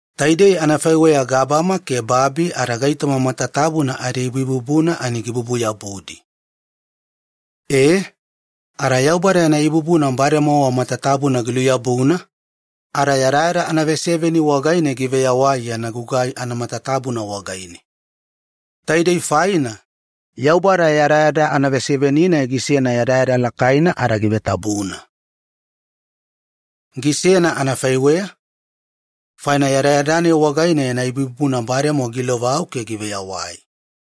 Taidei anafaiweya gabama ke babi ada gaitoma matatabuna adiibuibubuna idedeku giluyabu. E, ada Yaubada yana ibubuna bademowa matatabuna giluyabuna ada yadayada anaveseveni wagaine giveyawai yana gugai matatabuna wagaidiya. Taidei faina, Yaubada yadayada anaveseveni-nai giawanuwakabubuyena ada givetabuna. Gisena anafaiweya faina yadayada-nai wagaine yana ibubuna bademowa giilovau ke giveyawai.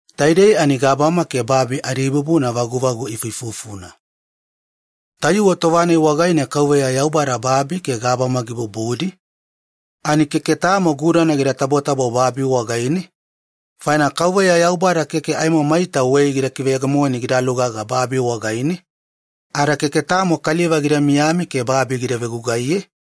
Taidei gabama ke babi adiibubuna vaguvagu ifuifufuna. Tayuwe tova-nai wagaine Yaubada babi ke gabama gibubudi, keke tamo gudana gida tabotabo babi wagaine, faina Yaubada keke maita wei gida kiveyegemoni gidalugaga babi wagaine. Ada keke tamo kaliva gida miyami ke babi gida vegugaiye.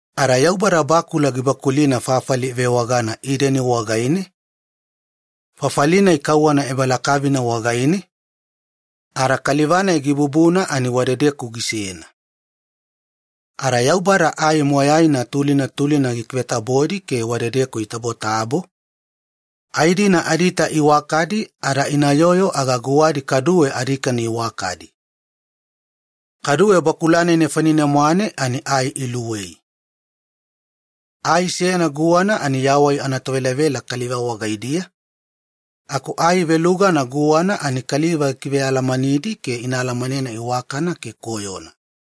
Ada Yaubada bakula seyana gikidewedewena fafali ivewagana Ideni wagaine, fafali-nai gadedeku kauwana ebalakavina wagaine. Wadedeku kaliva-nai gibubuna ani gisena. Ada Yaubada ai moyaina tulina tulina gikivetabodi ke wadedeku itabotabo, ai-dina adiita iwakadi ada inayoyo aga guwadi kaduwe adikani iwakadi. Kaduwe Yaubada ai luwei gikivetabodi bakula nefanine-mwane, ai seyana guwana ani yawai-vagata anatovelavela kaliva wagaidiya, aku ai velugana guwana ani kaliva gikivealamanidi ke ina alamanena iwakana ke koyona.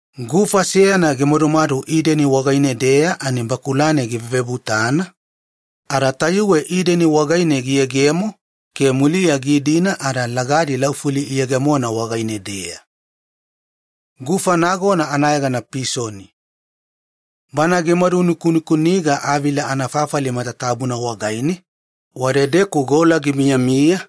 Gufa seyana gimadumadu Ideni wagaine-deya faina bakula-nai givevebutana, gufa tayuwe Ideni wagaine giyegemo ke muliya giidina ada lagadi laufuli iyegemona wagaine-deya. Ada gufa nagona anayegana Pisoni. Bana gimadu nikunikuniga Avila anafafali matatabuna wagaine, wadedeku gola gimiyamiya.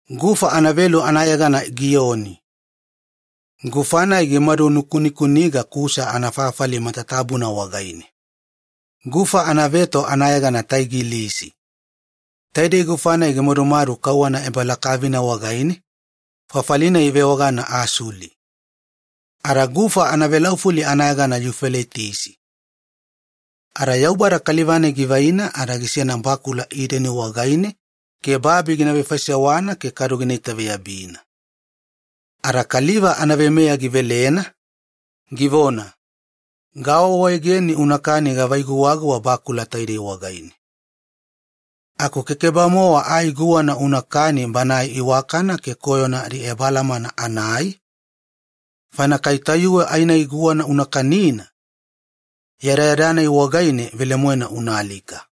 Gufa anavelu anayegana Gioni. Gufa-nai gimadu nukunikuniga Kusa anafafali matatabuna wagaine. Gufa anaveto anayegana Taigilisi. Taidei gufa-nai gimadumadu kauwana ebalakavina wagaine fafali-nai ivewagana Asuli. Ada gufa anavelaufuli anayegana Yufeletisi. E ada Yaubada kaliva-nai gisena bakula Ideni wagaine ada gina itaveyabina ke kadu babi gina vefaisewana. Ada kaliva anaveimeya givelena, givona, “Gawaawaegeni unakani gava ai guwaguwa bakula taidei wagaine. Aku kekeba-mowa ai guwana unakani banae iwakana ke koyona adiebalamana anaai. Kai tayuwe ai-nai guwana una kanina, yadayada-nai wagaine velemoena unaalika.”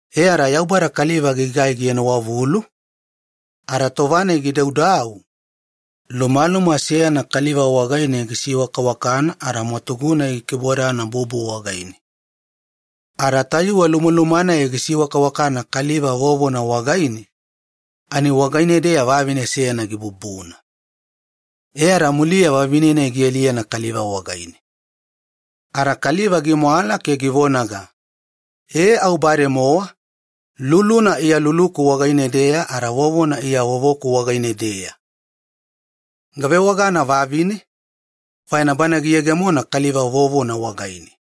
E ada Yaubada kaliva gigai gienowavulu. Tova-nai kaliva gidaudau aku lumalumana seyana gisiwakawakana, ada mwatugu-nai gikibodana vido wagaine. Ada tayuwe lumaluma-nai gisiwakawakana kaliva vovona wagaine ani wagaine-deya vavine seyana gibubuna. E ada muliya vavine-nai gialiyena kaliva wagaine. Ada kaliva gimwala ke givonaga, “E au bademowa, luluna iya luluku wagaine-deya ada vovona iya vovoku wagaine-deya! Gavewagana ‘vavine’, faina bana giyegemona kaliva vovona wagaine.”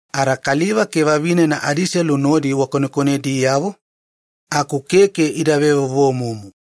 Ada kaliva ke vavine nodi konekonediyavo, aku adiselu keke ida vevovomumu.